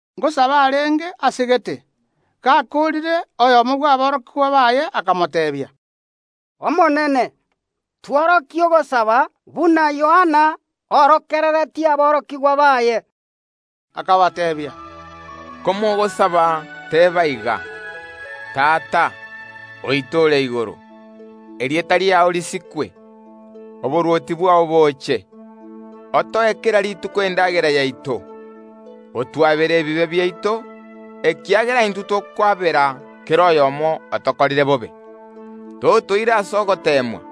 Ngosaba arenge aase gete. Gakoorire, oyomo bw’aborokigwa baye akamoteebia, “Omonene, twegerie ogosaba buna Yohana aegeretie aborokigwa baye.” Akabateebia, Komogosaba, teba iga: Tata, Erieta riao risikwe, Oborwoti bwao boche, Otoe kera rituko endagera yaito. Otwabere ebibe biaito, ekiagera intwe tokwabera kera oyomo otokorire bobe. Totoira ase ogoteemwa.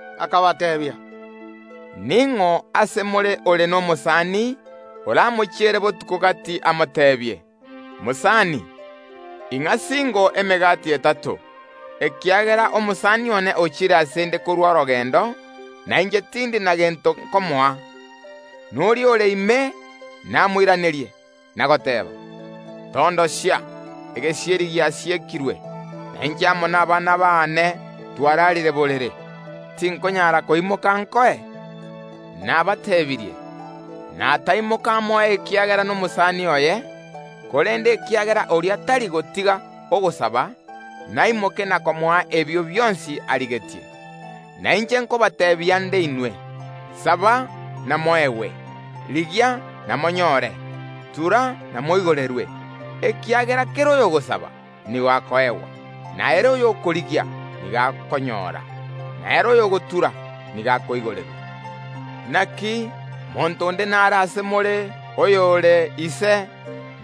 Akabateebia, “Ning’o ase more ore nomosani oramochiere botuko gati amoteebie: Mosani, ing’a singo emegati etato, ekiagera omosani one ochire ase ’nde korwa orogendo, na inche tindi na gento nkomoa; na oria ore ime namoiranerie, na goteeba: Tondosia, egesieri giasiekirwe, na inche amo nabana baane twararire borere, tinkonyara koimoka nkoe? Nabatebirie, nataimoka amoe ekiagera nomosani oye, korende ekiagera oria tari gotiga ogosaba, naimoke na komoa ebio bionsi arigetie. Na inche nkobateebia nde inwe: Saba, namoegwe; rigia, namonyore; tura, namoigorerwe. Ekiagera kera oyogosaba, nigo akoegwa, na ere oyokorigia, nigo akonyora, na ere oyogotura, nigo akoigorerwa. Naki monto onde nare ase more oyore ise,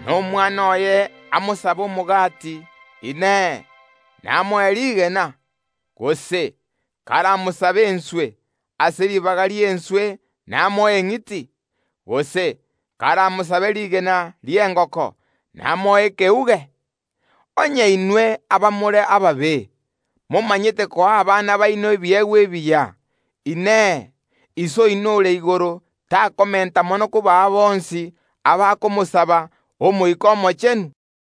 na omwana oye amosabe omogati, Inee, namoe rigena? Gose karamosabe enswe, ase ribaga ri’enswe namoe eng’iti? Gose karamosabe rigena ri’engoko namoe riagaga? Onye inwe, abamore ababe, momanyete koa abana baino ebiegwa ebiya, Inee, Iso oino ore igoro takomenta mono kobaa bonsi, abakomosaba, Omoika Omochenu?”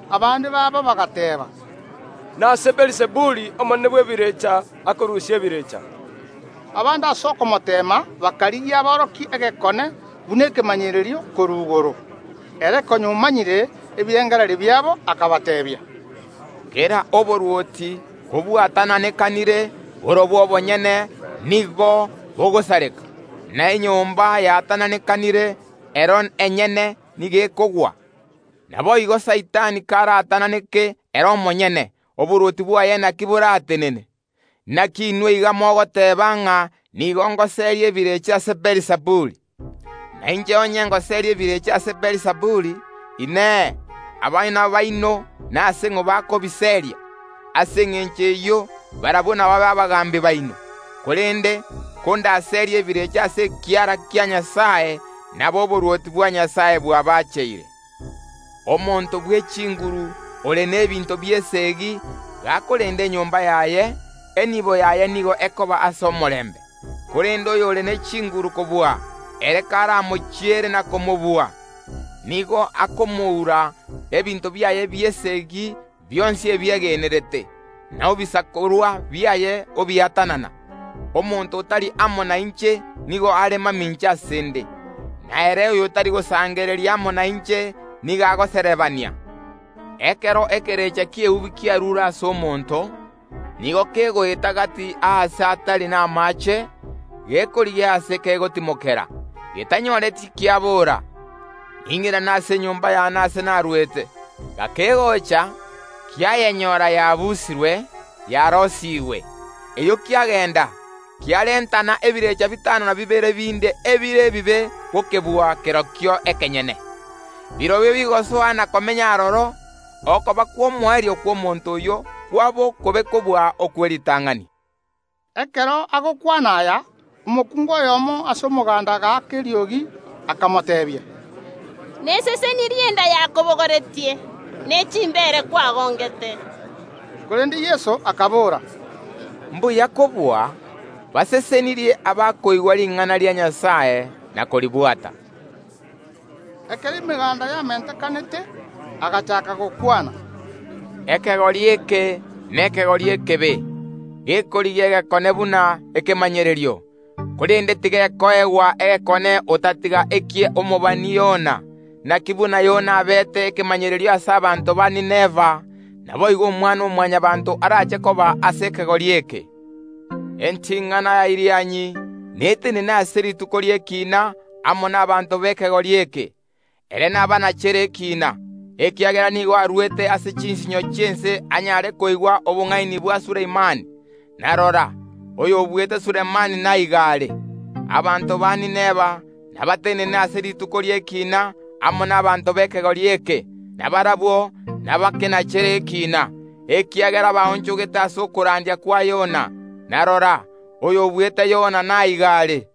Abande babo bagateeba, “Nase Beelizebuli, omonene bw’ebirecha, akorusia ebirecha.” Abande ase okomoteema bakarigia aborokie egekone buna ekemanyererio korwa igoro. Ere konya omanyire ebirengererio biabo, akabateebia, “Kera oborwoti kobwatananekanire borobwo obonyene nigo b’ogosareka, na enyomba yaatananekire ero enyene nigo ekogwa. Naboigo Saitani karaatananeke ere omonyene, oborwoti bwaye naki boratenene? Naki inwe iga mogoteeba ng’a nigo ngoseria ebirecha ase Beelizebuli. Na inche onye ngoseria ebirecha ase Beelizebuli, Inee, abana baino nase ng’o bakobiseria? Ase engencho eyio, barabwo nababe abagaambi baino. Korende kondaserie ebirecha ase ekiara kia Nyasae, nabo oborwoti bwa Nyasae bwabacheire. Omonto bw’echinguru ore n’ebinto bi’esegi, gakorenda enyomba yaye, enibo yaye nigo ekoba ase omorembe, korende oyore ne chinguru kobua, ere karamochiere na komobua, nigo akomoura ebinto biaye bi’esegi bionsi ebiegenerete, na ebisakorwa biaye obiatanana. Omonto otari amo nainche nigo are mamincha ase ’nde, na ere oyotari gosangereria amo nainche nigo agoserebania. “Ekero ekerecha ki’eubi kiarure ase omonto, nigo kegoeta gati aase atari namaache, gekorigia aase kegotimokera; getanyoreti kiabora: Ning’irane ase enyomba yane ase narwete. Gakegocha, kiayenyora yaabusirwe, yaroisigwe. Erio kiagenda, kiarentana ebirecha bitano na bibere binde ebire ebibe gokebua kerokio ekenyene. Birobio bigosoa na komenya aroro; okoba kw’omoerio kw’omonto oyio kwaba okobe kobua okwe ritang’ani.” Ekero agokwana aya, omokungu oyomo ase omoganda agaaka eriogi, akamoteebia, “Nesesenirie enda yakobogoretie, ne chimbeere kwagongete!” Korende Yeso akabora, “Mbuya kobua, basesenirie abakoigwa ring’ana ria Nyasae na koribwata!” Ekero emeganda yamentekanete, agachaaka gokwana, “Ekegori eke nekegori ekebe, gekorigia egekone buna ekemanyererio, korende tigekoegwa egekone otatiga eki’omobani Yona. Naki buna Yona abeete ekemanyererio ase abanto ba Ninawi, naboigo Omwana‐o‐Mwanyabaanto arache koba ase ekegori eke. Enting’ana ya Irianyi netenene ase rituko ri’ekiina amo nabaanto b’ekegori eke; ere nabanachere ekiina, ekiagera nigo arwete ase chinsinyo chi’ense anyare koigwa obong’aini bwa Sulemani; na rora, oyobuete Sulemani naiga are. Abanto ba Ninawi nabatenene ase rituko ri’ekiina amo nabaanto b’ekegori eke, na barabwo nabakenachere ekiina ekegori eke, ekiagera baonchogete ase okorandia kwa Yona; na rora, oyobuete Yona naiga are.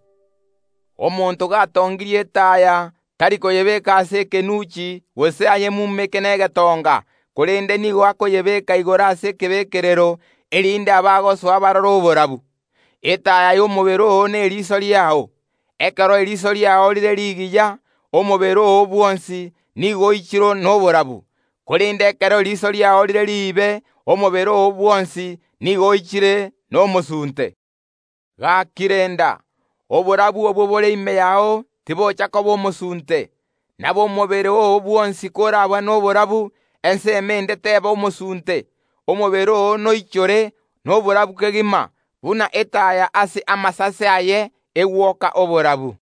“Omonto gatongirie etaaya tari koyebeeka ase ekenunchi gose ayemumeke negetonga, korende nigo akoyebeeka igoro ase ekebekerero, erinde abagosoa barore oborabu. Etaaya y’omobere oo neriiso riao; ekero eriso riao rire rigiya, omobere oo bwonsi nigo oichire noborabu; korende ekero eriiso riao rire riibe, omobere oo bwonsi nigo oichire nomosunte. Gaki renda, oborabu obwo bore ime yao tibocha koba omosunte. Nabo omobere oo bwonsi korabe noborabu, ensemo ende teba omosunte, omobere oo noichore noborabu kegima, buna etaya ase amasase aye egwoka oborabu.”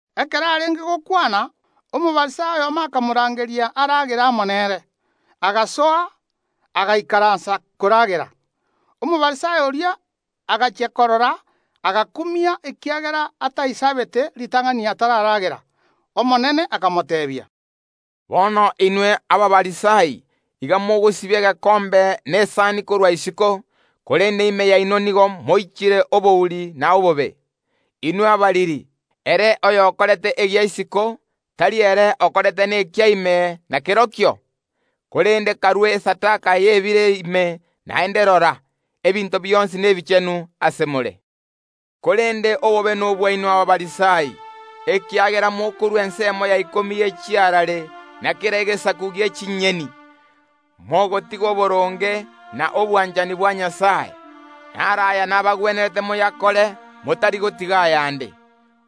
Ekero arenge gokwana, Omofarisai oyomo akamorangeria aragere amo nere. Agasoa, agaikaransa koragera. Omofarisai oria agachia korora, agakumia ekiagera ataisabete ritang’ani atararagera. Omonene akamoteebia, “Bono inwe Abafarisai iga mogosibia egekombe na esani korwa isiko, korende ime yaino nigo moichire obouri na obobe. Inwe abariri, ere oyokorete egia isiko, tari ere okorete nekia ime nakerokio? Korende karue esadaka y’ebire ime; naende rora, ebinto bionsi nebichenu ase more. “Korende obobe nobwaino Abafarisai, ekiagera mokorua ensemo ya ikomi ye chiarare, na kera egesaku gie chinyeni, mogotiga oboronge na obwanchani bwa Nyasae. Naro aya nabagwenerete moyakore, motari gotiga ayande.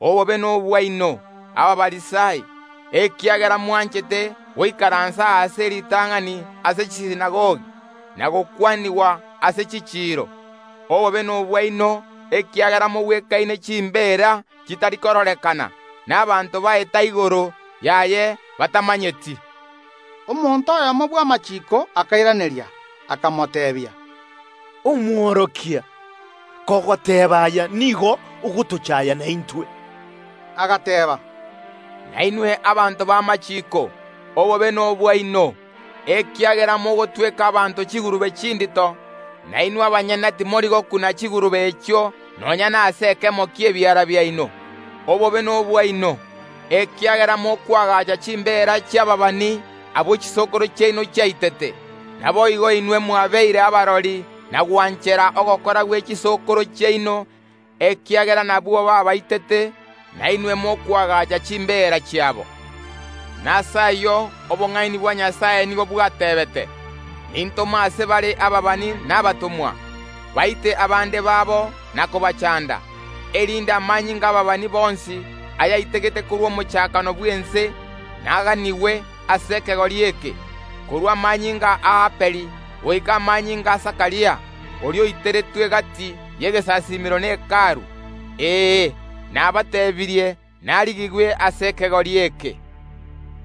Obobe nobwaino, Abafarisai! Ekiagera mwanchete goikaransa ebirogo bia bosio ase chisinagogi, na gokwanigwa namasikani ase chichiiro. Obobe nobwaino! Ekiagera mogwekaine chimbeera chitari kororekana, na abanto baeta igoro yaye batamanyeti.” Omworokia oyomo bw’amachiiko akairaneria, akamoteebia, “Omworokia, kogoteeba aya, nigo ogotochaaya naintwe.” Agateeba, “Nainwe aborokia b’amachiiko, obobe nobwaino! Ekiagera mogotweka abanto chigurube chindito, na inwe abanyene timori gokuna chigurube echio nonya nase ekemo ki’ebiara biaino. Obobe nobwaino! Ekiagera mokoagacha chimbeera chi’ababani, abwo chisokoro chiaino chiaitete. Naboigo inwe mwabeire abarori na gwanchera ogokora gwe chisokoro chiaino, ekiagera nabwo baabaitete, na inwe mokoagacha chimbeera chiabo. Nase ayio obong’aini bwa Nyasae nigo bwateebete: Nintome ase bare ababani na abatomwa; baite abande babo na kobachanda, erinde amanyinga y’ababani bonsi, ayaitegete korwa omochakano bw’ense naganigwe korwa ase ekegori eke, korwa amanyinga y’Abeli goika amanyinga a Zakaria; oria oiteretwe gati y’egesasiimero ne Hekalu. Ee, nabateebirie, narigigwe korwa ase ekegori eke.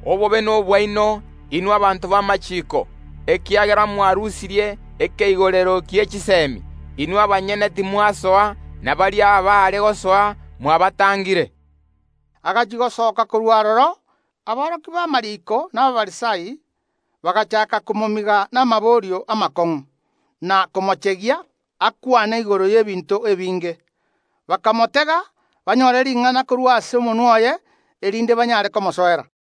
Obobe nobwaino, inwe aborokia b’amachiiko! Ekiagera mwarusirie ekeigorero gie chisemi; inwe abanyene timwasoa, na baria abaare gosoa mwabatangire.” Agachia gosoka korwa aroro, aborokia b’amariiko na Abafarisai bagachaaka komomiga namaborio amakong’u, na komochegia akwane igoro y’ebinto ebinge; bakomotega, banyore ring’ana korwa ase omonwa oye, erinde banyare komosoera.